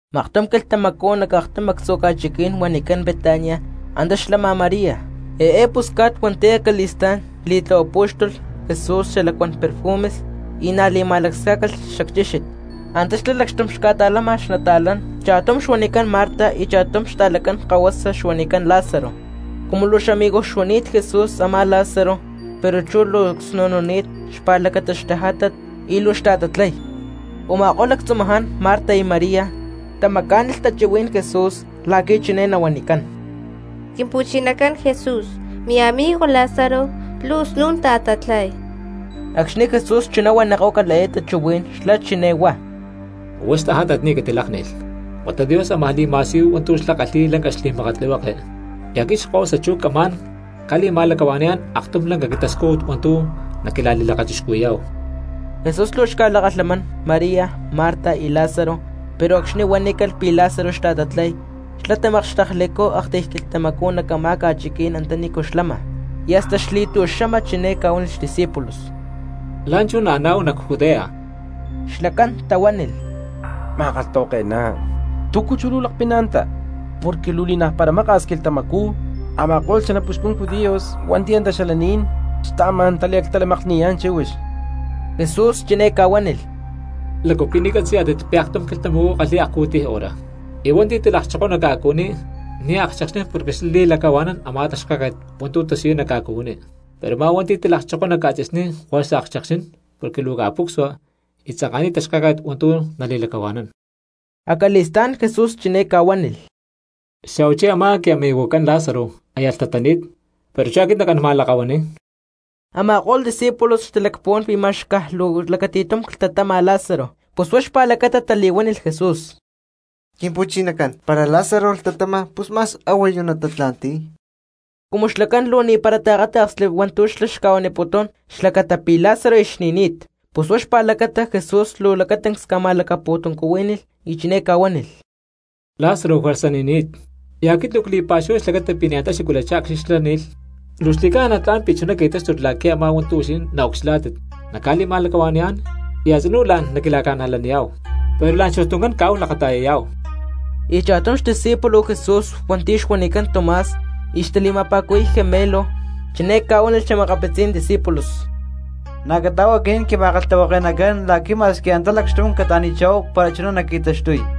Maktum quilhtamacú nac aktum actzu̠ ca̠chiquí̠n huanicán Betania antá xlama María, eé pusca̠t hua̠nti̠ acali̠stá̠n li̠tlahuapú̠xtulh Jesús xalacuán perfumes y na̠ li̠ma̠lacscá̠calh xacchíxit. Antá xlá lacxtum xca̠ta̠lama xnata̠lán, cha̠tum xuanicán Marta y cha̠tum xta̠lacán kahuasa xuanicán Lázaro. Cumu luu xamigo xuani̠t Jesús a̠má Lázaro, pero chú luu csnu̠nuni̠t xpa̠lacata xtajátat y luu xta̠tatlay. Uma̠kó̠lh lactzumaján Marta y María tamacá̠nilh tachuhuí̠n Jesús la̠qui̠ chiné nahuanicán: —Quimpu̠chinacán Jesús, miamigo Lázaro luu snu̠n ta̠tatlay. Acxni̠ Jesús chuná huanikó̠calh eé tachuhuí̠n xlá chiné huá: —Huá xtajátat ni̠ catilákni̠lh; huata Dios ámaj li̠ma̠siyuy hua̠ntu̠ xlá kalhi̠y lanca xli̠makatlihueke, y aquit Xkahuasa chú camá̠n ca̠li̠ma̠lacahua̠ni̠yá̠n aktum lanca quintascújut hua̠ntu̠ naquila̠li̠lakachixcuhui̠yá̠hu. Jesús luu xca̠lakalhamán María, Marta y Lázaro, pero acxni̠ huanícalh pi̠ Lázaro xta̠tatlay xlá tamakxtekchicú aktiy quilhtamacú nac a̠má ca̠chiquí̠n antanícu xlama. Y hasta xli̠tu̠xama chiné ca̠huánilh xdiscípulos: —La̠nchú naaná̠hu nac Judea. Xlacán tahuánilh; —Ma̠kalhtahuake̠ná, ¿túcu chú luu lakpina antá? Porque luu ni̠naj para maka̠s quilhtamacú a̠ma̠ko̠lh xanapuxcun judíos hua̠nti̠ antá xalaní̠n xtaamá̠n taliactalamakni̠yá̠n chíhuix. Jesús chiné ca̠huánilh: —¿Lácu pi̠ ni̠ catzi̠yá̠tit pi̠ aktum quilhtamacú kalhi̠y akcu̠tiy hora? Y hua̠nti̠ talakchokoy nac ca̠cuhuiní ni̠ akchekxnín porque xlá li̠lacahua̠nán a̠má taxkáket hua̠ntu̠ tasiyuy nac ca̠cuhuiní. Pero a̠má hua̠nti̠ talakchokoy nac ca̠tzi̠sní juerza akchekxnín porque luu ca̠pucsua y tzanka̠niy taxkáket hua̠ntu̠ nali̠lacahua̠nán. Acali̠stá̠n Jesús chiné ca̠huánilh: —Xa̠huachí a̠má quiamigojcán Lázaro aya lhtatani̠t pero chú aquit nacán ma̠lakahuani̠y. Ama̠ko̠lh discípulos xtalacpuhuán pi̠ ma̠x caj luu lacati̠tum clhtatama Lázaro pus huá xpa̠lacata tali̠huánilh Jesús: —Quimpu̠chinacán, para Lázaro lhtatama pus ma̠x a̠huayu natatla̠nti̠y. Cumu xlacán luu ni̠para taakáta̠ksli hua̠ntu̠ xlá xuaniputún xlacata pi̠ Lázaro aya xni̠ni̠t, pus huá xpa̠lacata Jesús luu lacatancs ca̠ma̠lacapu̠tuncuhuí̠nilh, y chiné ca̠huánilh: —Lázaro juerza ni̠ni̠t. Y aquit luu cli̠pa̠xuhuay xlacata pi̠ ni̠ antá xacuilachá acxni̠ xlá ni̠lh. Luu xli̠ca̠na tla̠n pi̠ chuná qui̠táxtulh la̠qui̠ a̠má hua̠ntu̠ huixinín naucxilhá̠tit naca̠li̠macuaniyá̠n y a̠tzinú la̠n naquila̠ca̠najlaniyá̠hu. Pero la̠nchú tuncán caáhu lakata̠yayá̠hu. Y cha̠tum xdiscípulo Jesús hua̠nti̠ xuanicán Tomás y xtali̠ma̠pa̠cuhui̠y Gemelo, chiné ca̠huánilh xa̠makapitzí̠n discípulos: —Na̠ cata̠áhu aquinín quima̠kalhtahuake̠nacán la̠qui̠ ma̠squi antá lacxtum cata̠ni̠chá̠hu para chuná naqui̠taxtuy.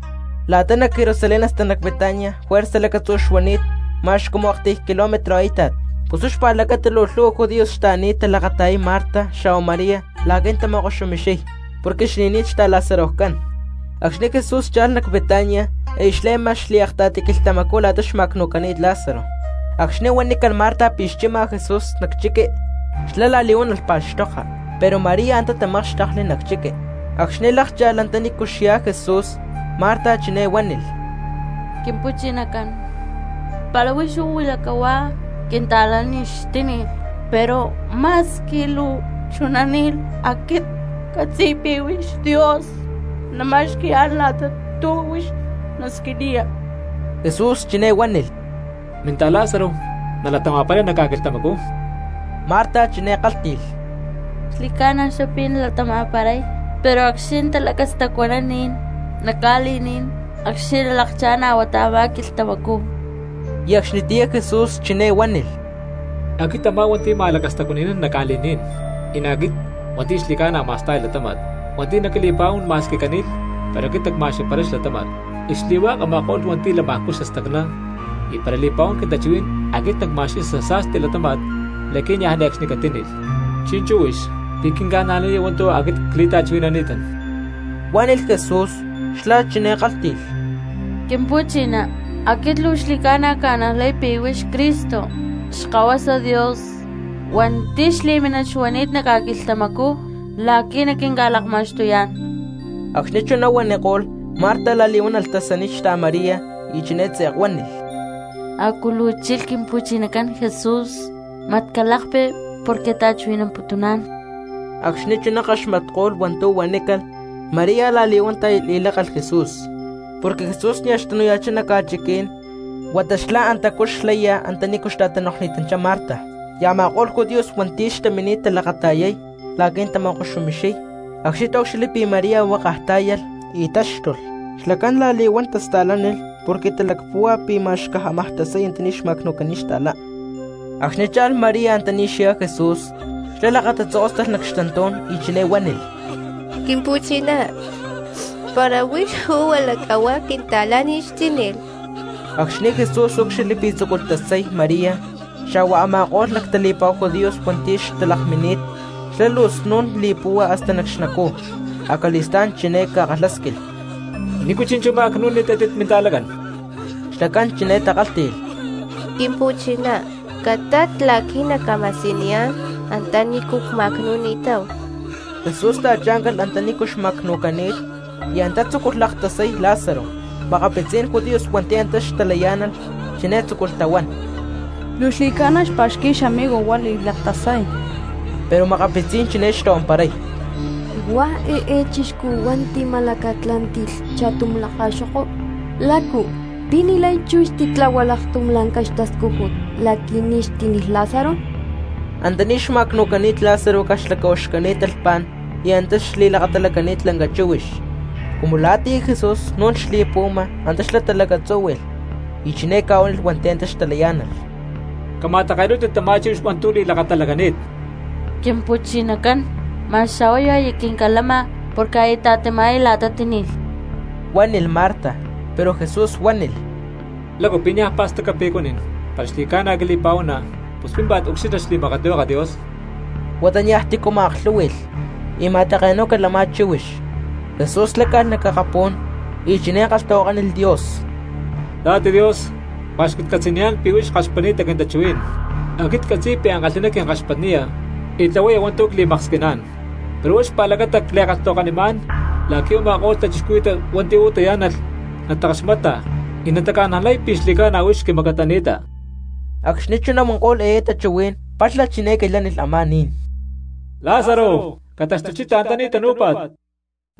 La̠ta nac Jerusalén hasta nac Betania juerza lacatzú xuani̠t ma̠x cumu aktiy kilómetro a̠íta̠t. Pus huá xpa̠lacata luu lhu̠hua judíos xtaani̠t talakata̠yay Marta xa̠hua María la̠qui̠ natama̠koxumixiy porque xni̠ni̠t xta̠Lázarojcán. Acxni̠ Jesús cha̠lh nac Betania aya xle̠ma xliakta̠ti quilhtamacú la̠ta xma̠cnu̠cani̠t Lázaro. Acxni̠ huanícalh Marta pi̠ xchima Jesús nac chiqui xlá la̠li̠huán alh pa̠xtoka, pero María antá tamákxtekli nac chiqui. Acxni̠ lákcha̠lh antanícu xyá Jesús Marta chiné huánilh: —Quimpu̠chinacán, para huix uú huila cahuá, quinta̠lá ni̠ xtíni̠lh. Pero ma̠squi luu chuná, aquit ccatzi̠y pi̠ Dios nama̠xqui̠yá̠n la̠tachá túcu huix nasquiniya. Jesús chiné huánilh: —Minta̠Lázaro nalatama̠paray nac ca̠quilhtamacú. Marta chiné kálhti̠lh: —Xli̠ca̠na xlá pi̠ nalatama̠paray, pero acxni̠ natalacastacuanán ni̠n nac ca̠li̠ní̠n acxni̠ nalakchá̠n a̠huatá a̠má quilhtamacú. Y acxnitiyá Jesús chiné huánilh: —Aquit a̠má hua̠nti̠ ma̠lacastacuani̠nán nac ca̠li̠ní̠n, y na̠ aquit hua̠nti̠ xli̠ca̠na ma̠sta̠y latáma̠t, hua̠nti̠ naquili̠pa̠huán ma̠squi cani̠lh pero aquit nacma̠xqui̠paray xlatáma̠t. Y xli̠hua̠k a̠ma̠ko̠lh hua̠nti̠ lamajcú xastacná y para li̠pa̠huán quintachuhuí̠n aquit nacma̠xqui̠y xasa̠sti latáma̠t la̠qui̠ niaj ne̠cxni catíni̠lh. Chi̠nchú huix, ¿pi̠ quinca̠najlaniya hua̠ntu̠ aquit cli̠ta̠chuhui̠nani̠tán? —huánilh Jesús. Xlá chiné kálhti̠lh: —Quimpu̠chiná, aquit luu xli̠ca̠na cca̠najlay pi̠ huix Cristo Xkahuasa Dios hua̠nti̠ xli̠mínit xuani̠t nac ca̠quilhtamacú la̠qui̠ naquinca̠lakma̠xtuyá̠n. Acxni̠ chuná huaniko̠lh, Marta la̠li̠huán alh tasaniy xta̠María y chiné tze̠k huánilh: —Acu luu chilh Quimpu̠chinacán Jesús, mat calakpi porque ta̠chuhui̠namputuná̠n. Acxni̠ chuná kaxmatko̠lh hua̠ntu̠ huanícalh, María la̠li̠huán tá̠yalh y lákalh Jesús, porque Jesús nia̠ xtanu̠ya̠chá nac ca̠chiquí̠n, huata xlá antacú xlaya antanícu xta̠tanoklhni̠tanchá Marta. Y a̠ma̠ko̠lh judíos hua̠nti̠ xtamini̠t talakata̠yay la̠qui̠ natama̠koxumixiy, acxni̠ taúcxilhli pi̠ María huákaj tá̠yalh y táxtulh, xlacán la̠li̠huán tasta̠lánilh porque talacpúhua pi̠ ma̠x caj xámaj tasay antaní xma̠cnu̠cani̠t xta̠lá. Acxni̠ cha̠lh María antaní xyá Jesús, xlá lakatatzokóstalh nac xtantú̠n y chiné huánilh: —Quimpu̠chinacán, para huix uú huila cahuá quinta̠lá ni̠ xtíni̠lh. Acxni̠ Jesús úcxilhli pi̠ tzúculh tasay María xa̠hua a̠ma̠ko̠lh lactali̠pa̠hu judíos hua̠nti̠ xtalakmini̠t, xlá luu snu̠n li̠púhua hasta nac xnacú. Acali̠stá̠n chiné ca̠kalhásquilh: —¿Nícu chi̠nchú ma̠cnu̠ni̠tátit minta̠lacán? Xlacán chiné takálhti̠lh: —Quimpu̠chinacán, catat la̠qui̠ nacca̠ma̠siyuniyá̠n antanícu cma̠cnu̠ni̠táhu. Jesús ta̠chá̠ncalh antanícu xma̠cnu̠cani̠t, y antá tzúculh laktasay Lázaro. Makapitzí̠n judíos hua̠nti̠ antá xtalayá̠nalh chiné tzúculh tahuán: —Luu xli̠ca̠na xpa̠xqui̠y xamigo huá li̠laktasay. Pero makapitzí̠n chiné xtahuamparay: —Huá eé chixcú hua̠nti̠ tima̠lacatlá̠nti̠lh cha̠tum lakaxo̠ko, ¿lácu pi̠ ni̠lay chú xtitláhualh aktum lanca xtascújut la̠qui̠ ni̠ xtíni̠lh Lázaro? Antaní xma̠cnu̠cani̠t Lázaro caj xlacahuaxcani̠t talhpá̠n y antá xli̠lakatalacani̠t lanca chíhuix. Cumu la̠tiyá Jesús snu̠n xli̠puhuama antá xlá talacatzúhui̠lh, y chiné ca̠huánilh hua̠nti̠ xtalayá̠nalh: —Cama̠take̠nú̠tit tamá chíhuix hua̠ntu̠ li̠lakatalacani̠t. —Quimpu̠chinacán, ma̠x a̠huayu aya quincalama porque aya ta̠ti̠mayá la̠ta tíni̠lh —huánilh Marta. Pero Jesús huánilh: —¿Lácu pi̠ niaj pa̠staca pi̠ cuanín, para xli̠ca̠na quili̠pa̠huana, pus pímpa̠t ucxilha xli̠makatlihueke Dios? Huata niaj tícu ma̠aklhú̠hui̠lh, y ma̠take̠nú̠calh a̠má chíhuix. Jesús láca̠lh nac akapú̠n y chiné kalhtahuakánilh Dios: —Papá Dios, cpa̠xcatcatzi̠niyá̠n pi̠ huix kaxpatni̠ta quintachuhuí̠n. Aquit ccatzi̠y pi̠ ankalhi̠ná quinkaxpatniya y tlahuaya hua̠ntu̠ cli̠maksquiná̠n, pero huá xpa̠lacata cli̠kalhtahuakanimá̠n la̠qui̠ u̠ma̠ko̠lh cristianos hua̠nti̠ uú tayá̠nalh natakaxmata y nataca̠najlay pi̠ xli̠ca̠na huix quimacatani̠ta. Acxni̠ chuná huanko̠lh eé tachuhuí̠n, palha chiné quilhánilh a̠má ni̠n: —¡Lázaro, cataxtuchita antaní tanú̠pa̠t!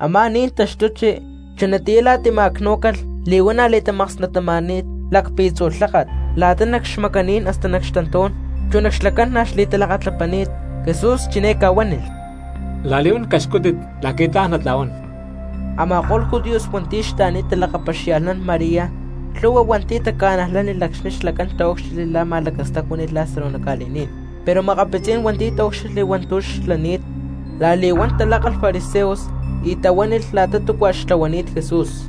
Amá ni̠n taxtuchi, chunatiyá la̠ta tima̠cnú̠calh li̠huana̠ li̠tamaksnattama̠ni̠t lacpi̠tzu̠ lháka̠t la̠ta nac xmacaní̠n hasta nac xtantú̠n, chu nac xlacán na̠ xtalakatlapani̠t. Jesús chiné ca̠huánilh: —La̠li̠huán caxcúttit la̠qui̠ tla̠n natla̠huán. Ama̠ko̠lh judíos hua̠nti̠ xtaani̠t talakapaxia̠lhnán María lhu̠hua hua̠nti̠ taca̠najlánilh acxni̠ xlacán taúcxilhli la̠ ma̠lacastacuáni̠lh Lázaro nac ca̠li̠ní̠n. Pero makapitzí̠n hua̠nti̠ taúcxilhli hua̠ntu̠ xlani̠t la̠li̠huán talákalh fariseos y tahuánilh la̠ta túcua xtlahuani̠t Jesús.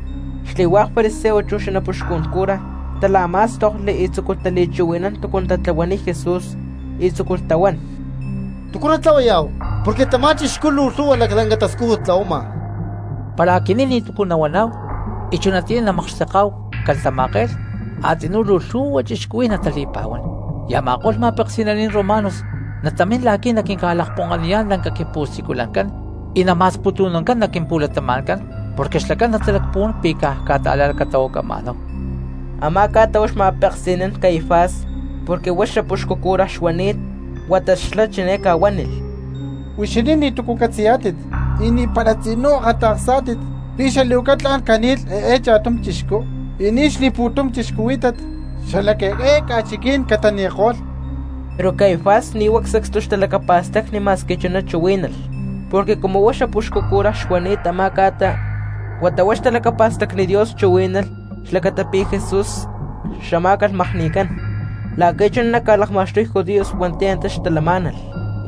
Xli̠hua̠k fariseos chu xanapuxcun cura tala̠má̠stokli y tzúculh tali̠chuhui̠nán túcu natatlahuay Jesús y tzúculh tahuán: —¿Túcu natlahuayá̠hu? Porque tamá chixcú luu lhu̠hua laclanca tascújut tlahuama. Para aquinín ni̠túcu nahuaná̠hu y chunatiyá namakxteká̠hu calatama̠ke̠lh a̠tzinú luu lhu̠hua cristianos natali̠pa̠huán, y a̠ma̠ko̠lh ma̠peksi̠naní̠n romanos natamín la̠qui̠ naquinca̠lakponkaniyá̠n lanca quimpu̠siculancán y nama̠sputu̠nancán nac quimpu̠latama̠ncán porque xlacán natalacpuhuá̠n pi̠ caj ca̠ta̠la̠lacatahuacama̠náhu. Amá ca̠ta huá xma̠peksi̠nán Caifás porque huá xapuxcu cura xuani̠t. Huata xlá chiné ca̠huánilh: —Huixinín ni̠túcu catzi̠yá̠tit, y ni̠para tzinú akata̠ksá̠tit pi̠ xali̠huaca tla̠n cani̠lh eé caj cha̠tum chixcú y ni̠ xli̠pu̠tum cristianos xala eé ca̠chiquí̠n catani̠ko̠lh. Pero Caifás ni̠ huá sacstu xtalacapa̠stacni ma̠squi chuná chuhuí̠nalh, porque cumu huá xapuxcu cura xuani̠t a̠má ca̠ta, huata huá xtalacapa̠stacni Dios chuhuí̠nalh xlacata pi̠ Jesús xamá̠calh makni̠cán la̠qui̠ chuná naca̠lakma̠xtuy judíos hua̠nti̠ antá xtalamá̠nalh.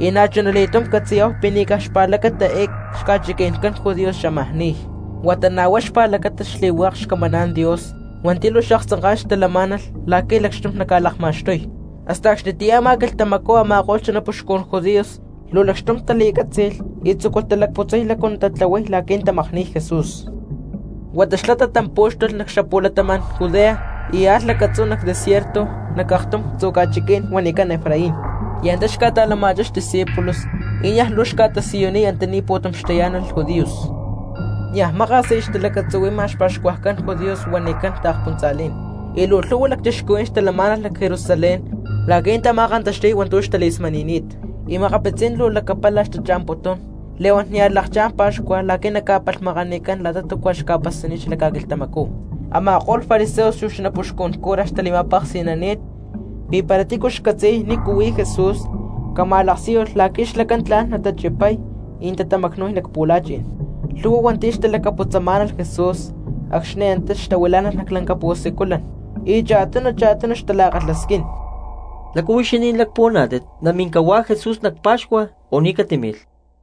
Y na̠chuna li̠túm catzi̠yá̠hu pi̠ ni̠ caj xpa̠lacata eé xca̠chiqui̠ncán judíos xámaj ni̠y, huata na̠ huá xpa̠lacatacán xli̠hua̠k xcamaná̠n Dios hua̠nti̠ luu xaaktzanká̠n talamá̠nalh la̠qui̠ lacxtum naca̠lakma̠xtuy. Hasta acxnitiyá a̠má quilhtamacú a̠ma̠ko̠lh xanapuxcun judíos luu lacxtum tali̠cátzi̠lh y tzúculh talacputzay lácu natatlahuay la̠qui̠ natamakni̠y Jesús. Huata xlá tatampú̠xtulh nac xapu̠latama̠n Judea y alh lacatzú nac desierto nac aktum actzu̠ ca̠chiquí̠n huanicán Efraín y antá xca̠ta̠lama̠chá xdiscípulos, y niaj luu xca̠tasiyuniy antaní pu̠tum tayá̠nalh judíos. Niaj maka̠s aya xtalacatzuhui̠ma xpa̠xcuajcán judíos huanicán taakspuntza̠lí̠n, y luu lhu̠hua cristianos xtaamá̠nalh nac Jerusalén la̠qui̠ natama̠kantaxti̠y hua̠ntu̠ xtali̠smani̠ni̠t; y makapitzí̠n luu lacapala xtacha̠mputún li̠huán nia̠ xlakchá̠n pa̠xcua la̠qui̠ naca̠palhmakanicán la̠ta túcua xca̠pasani̠t xala ca̠quilhtamacú. Ama̠ko̠lh fariseos chu xanapuxcun cura xtali̠ma̠peksi̠nani̠t, pi̠ para tícu xcatzi̠y nícu huí Jesús cama̠laksíyulh la̠qui̠ xlacán tla̠n natachipay y natatamacnu̠y nac pu̠la̠chi̠n. Lhu̠hua hua̠nti̠ xtalacaputzamá̠nalh Jesús acxni̠ antá xtahuilá̠nalh nac lanca pu̠siculan y cha̠tunu cha̠tunu xtala̠kalhasquín: —¿Lácu huixinín lacpuhuaná̠tit, namin cahuá Jesús nac pa̠xcua, o ni̠ catímilh?